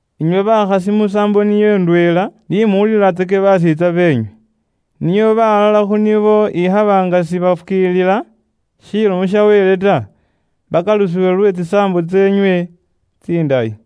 Inywe bakhasi musaambo niyo ndweela, ni muwulilatsake baseetsa beenywe, nio balala khu nibo ikhaba nga sibafukiilila Ilomo ya Wele ta, bakalusibwe lwe tsisaambo tseenywe tsindayi.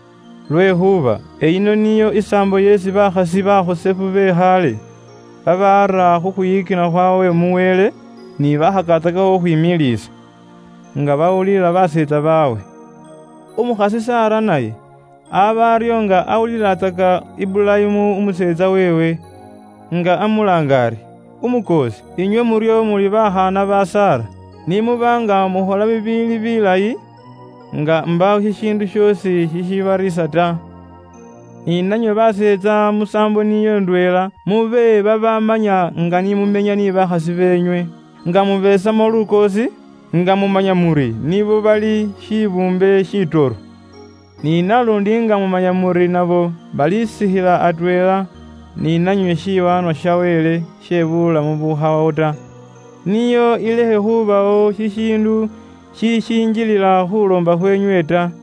Lwekhuuba eyino niyo isaambo isi bakhasi bakhosefu be khaale babaara khukhwiyikina khwawe mu Wele ni bakhakatsakakho khukhwimiliisa, nga bawulila baseetsa bawe. Umukhasi Sara naye aba aryo nga awulilatsaka Iburayimu umuseetsa weewe nga amulaanga ari, “Umukoosi.” Inywe muryo muli bakhaana ba Sara, ni muba nga mukhola bibiili biilayi, nga mbaawo shishiindu shoosi shishibariisa ta. Ni nanywe baseetsa musaambo niyo ndweela mube babaamanya nga ni mumenya ni bakhasi beenywe, nga mubeesamo lukoosi, nga mumanya muri nibo bali shibuumbe shitoro. Ni naluundi nga mumanya muri nabo balisikhila atweela ni nanywe shiwaanwa sha Wele she buulamu bukhawawo ta, nio ilekhe khubawo shishiindu shishishinjilila khuuloomba khweenywe ta.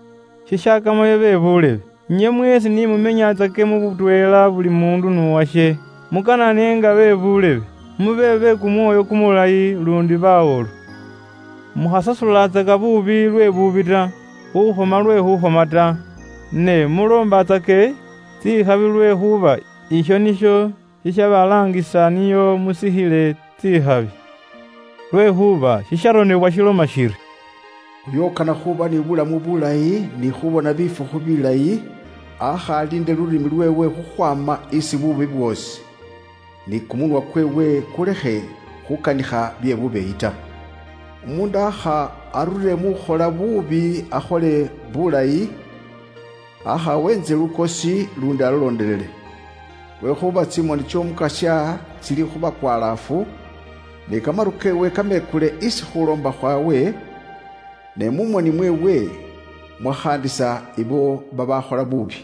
Shishakamayo be buulebe, inywe mweesi ni mumenyatsake mu butweela buli muundu n'uwashe. Mukanane nga be buulebe, mube be kumwoyo kumulayi luundi bawolu. Mukhasasulatsaka buubi lwe buubi ta, khuukhoma lwe khuukhoma ta. Ne muloombatsake tsikhabi lwekhuuba isho nisho shishabalaangisa nio musikhile tsikhabi. Lwekhuuba shisharonebwa shiloma shiri, “Uyo ukana khuuba ni buulamu bulayi ni khuubona bifukhu bilayi, aakha aliinde lulimi lweewe isi buubi bwoosi, ni kumunwa kweewe kulekhe khukanikha bye bubeeyi ta. Umuundu aakha arure mu khukhola buubi akhole bulayi, aakha aweentse lukoosi luundi alulondelele. Lwekhuuba tsimoni ts'Omukasya tsili khu bakwalaafu, ni kamaru keewe kamekule isi khuuloomba khwaabwe, ne mu moni mweewe mukhaandisa abo babaakhola buubi.”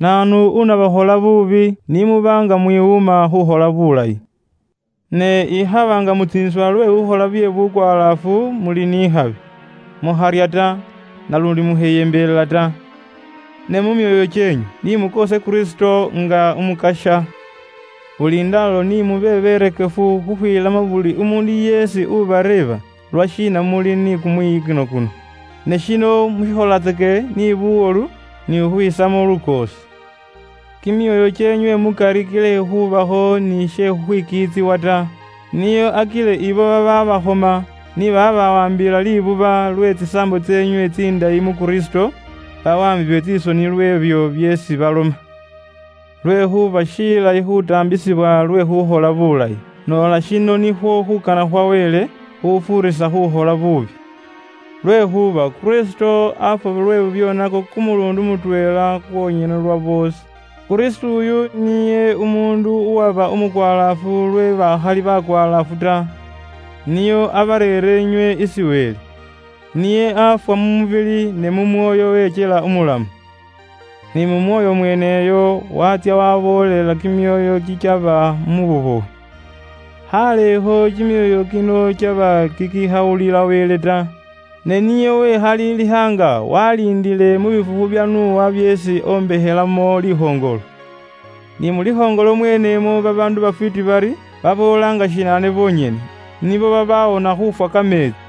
Naanu unabakhola buubi ni muba nga mwiwuuma khuukhola buulayi? Ne ikhaba nga mutsiinisibwa lwe khuukhola bye bukwalaafu muli ni khabi. Mukharya ta, naluundi mukheyembelela ta. Ne mu myoyo kyeenywe, ni mwiisemo Kristo lukoosi nga mumanya muri ali Umukasya umukhosefu. Buli ndaalo ni mube berekefu khukhwiilamo buli umuundu yeesi ubareeba lwashiina muli ni kumwiyikino kuno. Ne shino mushikholatsake ni buwolu ni khukhwisamo lukoosi. Kimyoyo kyeenywe mukari kilekhe khubakho ni she khukhwikiitsibwa ta, nio akile abo babaabakhoma ni babaabawaambila libuba lwe tsisaambo tseenywe tsindayi mu Kristo, bawaambibwe tsisoni lw'ebyo byeesi baloma. Lwekhuuba shilayi khuutaambisibwa lwe khuukhola buulayi, noola shino nikhwo khuukana khwa Wele, khufuurisa khuukhola buubi. Lwekhuuba Kristo aafwa lwe bibyoonako kumuluundi mutweela kwonyene lwa boosi, nga umwiyikinwa aafwa khulwe babaakhali babeyikinwa ta, nio abareere inywe isi Wele. Niye aafwa mu mubili ne mu mwoyo wekyela umulamu. Ni mu mwoyo mweeneyo waatsya waaboolela kimyoyo kikyaba mu bubowe. —7.24Khaalekho kimyoyo kino kyaba kikikhawulila Wele ta, ne niye wekhaliilikha nga waliindile mu bifukhu bya Nowa byeesi ombekhelamo likhoŋolo. Ni mu likhoŋolo mweenemwo babaandu bafwiiti bari, baboola nga shinaane bonyene, nibo babaawona khuufwa kameetsi.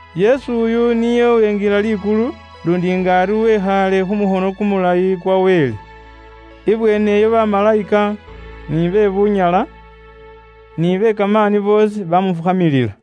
Yesu oyu niye uwenjila likulu, luundi nga ari wekhaale khu mukhono kumulayi kwa Wele. Ibweeneyo bamalayika, ni be bunyala, ni be kamaani boosi bamufukhamilila.